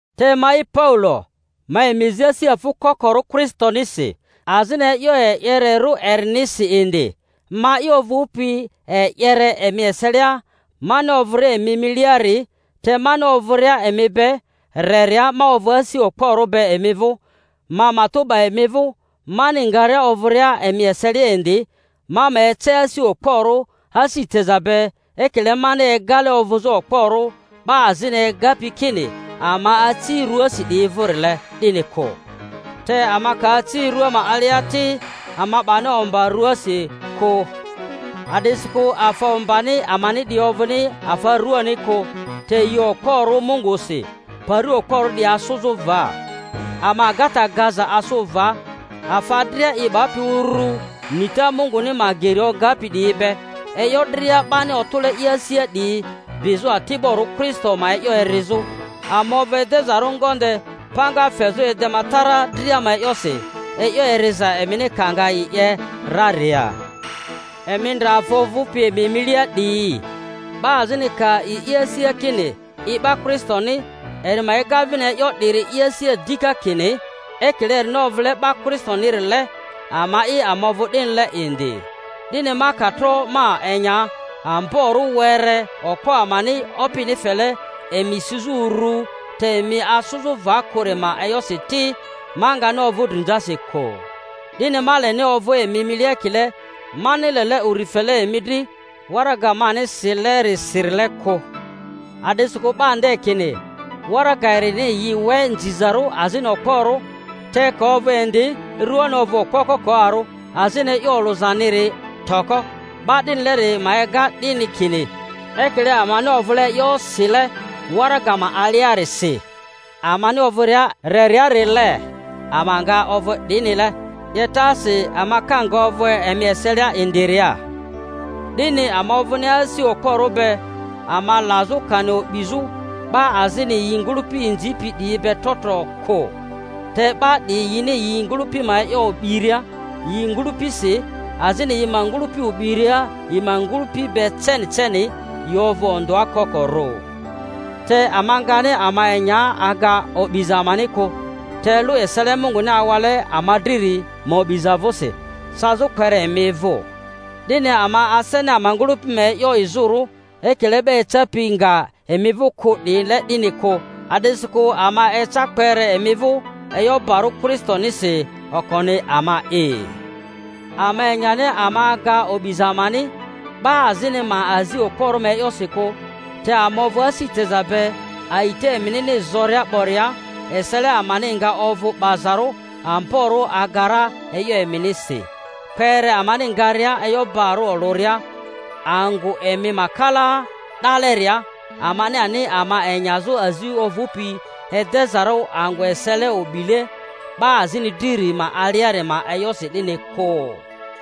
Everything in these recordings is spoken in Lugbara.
Te ma'i Paulo, ma emi zi asi afᴜ kokorᴜ Kristonisi, azini e'yo e'yererᴜ erinisi indi—ma'i ovᴜpi e'yere emi eselia mani ovᴜria emi miliari, te mani ovᴜria emi be reria ma ovᴜ asi okporᴜ be emi vᴜ— ma matᴜ 'ba emi vᴜ, mani ngaria ovᴜria emi eselia indi ma ma ece asi okporᴜ asi teza be, ekile mani egale ovᴜzᴜ okporᴜ 'ba azini egapi kini ama aci ruasi 'diyi vᴜrile, 'dini kᴜ. Te ama ka aci rua ma alia ti, ama 'bani omba rᴜasi kᴜ, a'disikᴜ afa ombani amani 'diyi ovᴜni afa ruani kᴜ, te yi okporᴜ Mungusi pari okporᴜ 'diyi asᴜzᴜ va. Ama agata gaza asᴜ va, afa dria i 'bapi urᴜ nita Munguni ma geri ogapi 'diyi be, e'yo dria 'bani otᴜle i asia 'diyi bizᴜ ati'borᴜ Kristo ma e'yo erizᴜ; ama ovᴜ edezarᴜ ngonde panga fezᴜ edematara dria ma e'yosi, e'yo eriza emini ka nga i 'ye raria. Emi ndre afa ovᴜpi emi milia 'diyi. 'Ba azini ka a'i i asia kini i 'ba Kristoni, eri ma ega vini e'yo 'diri i asia dika, kini, ekile erini ovᴜle 'ba Kristonirile, ama'i ama ovᴜ 'dinile indi. 'Dini ma ka tro ma enya amborᴜ were okpo amani Opini fele emi sizᴜ uru, te emi asᴜzᴜ va kᴜri ma e'yosi ti, ma ngani ovᴜ drinzasi kᴜ. 'Dini ma leni ovᴜ emi milia ekile mani lele uri fele emi dri waraga mani silerisirile kᴜ. A'disikᴜ 'ba nde kini, Waraga erini yi we nzizarᴜ azini okporᴜ, te ka ovᴜ indi ruani okpo kokoarᴜ, azini e'yo olᴜzaniri toko. 'Ba 'dinileri ma ega 'dini, kini, ekile amani ovᴜle e'yo sile waraga ma aliarisi amani ovᴜria reriarile, ama nga ovᴜ 'dinile 'yetasi ama ka nga ovᴜ emi eselia indiria. 'Dini ama ovᴜni asi okporᴜ be ama lazᴜ kani o'bizᴜ 'ba azini yi ngᴜlᴜpi inzipi 'diyi be trotro kᴜ. Te 'ba 'diyi yini yi ngᴜlᴜpi ma e'yo o'biria yi ngᴜlᴜpisi, azini yi ma ngᴜlᴜpi o'biria yi ma ngᴜlᴜpi be ceni ceni, yi ovᴜ ondᴜa kokorᴜ. Te ama ngani ama enya aga o'biza amani kᴜ, te lᴜ esele Munguni awale ama driri ma o'biza vᴜsi, cazᴜ kpere emi vᴜ. 'Dini ama aseni ama ngᴜlᴜpi ma e'yo izᴜrᴜ, ekile 'ba ecapi nga emi vᴜ kᴜ 'diyile 'dini kᴜ; a'disikᴜ ama eca kpere emi vᴜ e'yo barᴜ Kristonisi okoni ama'i. Ama enyani ama aga o'biza amani, 'ba azini ma azi okporᴜ ma e'yosi kᴜ; te ama ovᴜ asi teza be, a'ita eminini zoria 'boria, esele amani nga ovᴜ 'bazarᴜ amborᴜ aga ra e'yo eminisi, kpere amani ngaria e'yo bari olᴜria angᴜ emi ma kala 'daleria, amani ani ama enyazᴜ azi ovᴜpi edezarᴜ angᴜ esele o'bile 'ba azini driri ma aliari ma e'yosi 'dini kᴜ.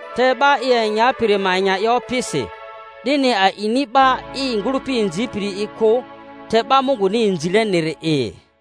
Te 'ba i enyapiri ma enya i Opisi. 'Dini a'ini 'ba i ngᴜlᴜpi inzipiri'i kᴜ, te 'ba Munguni inzileniri'i.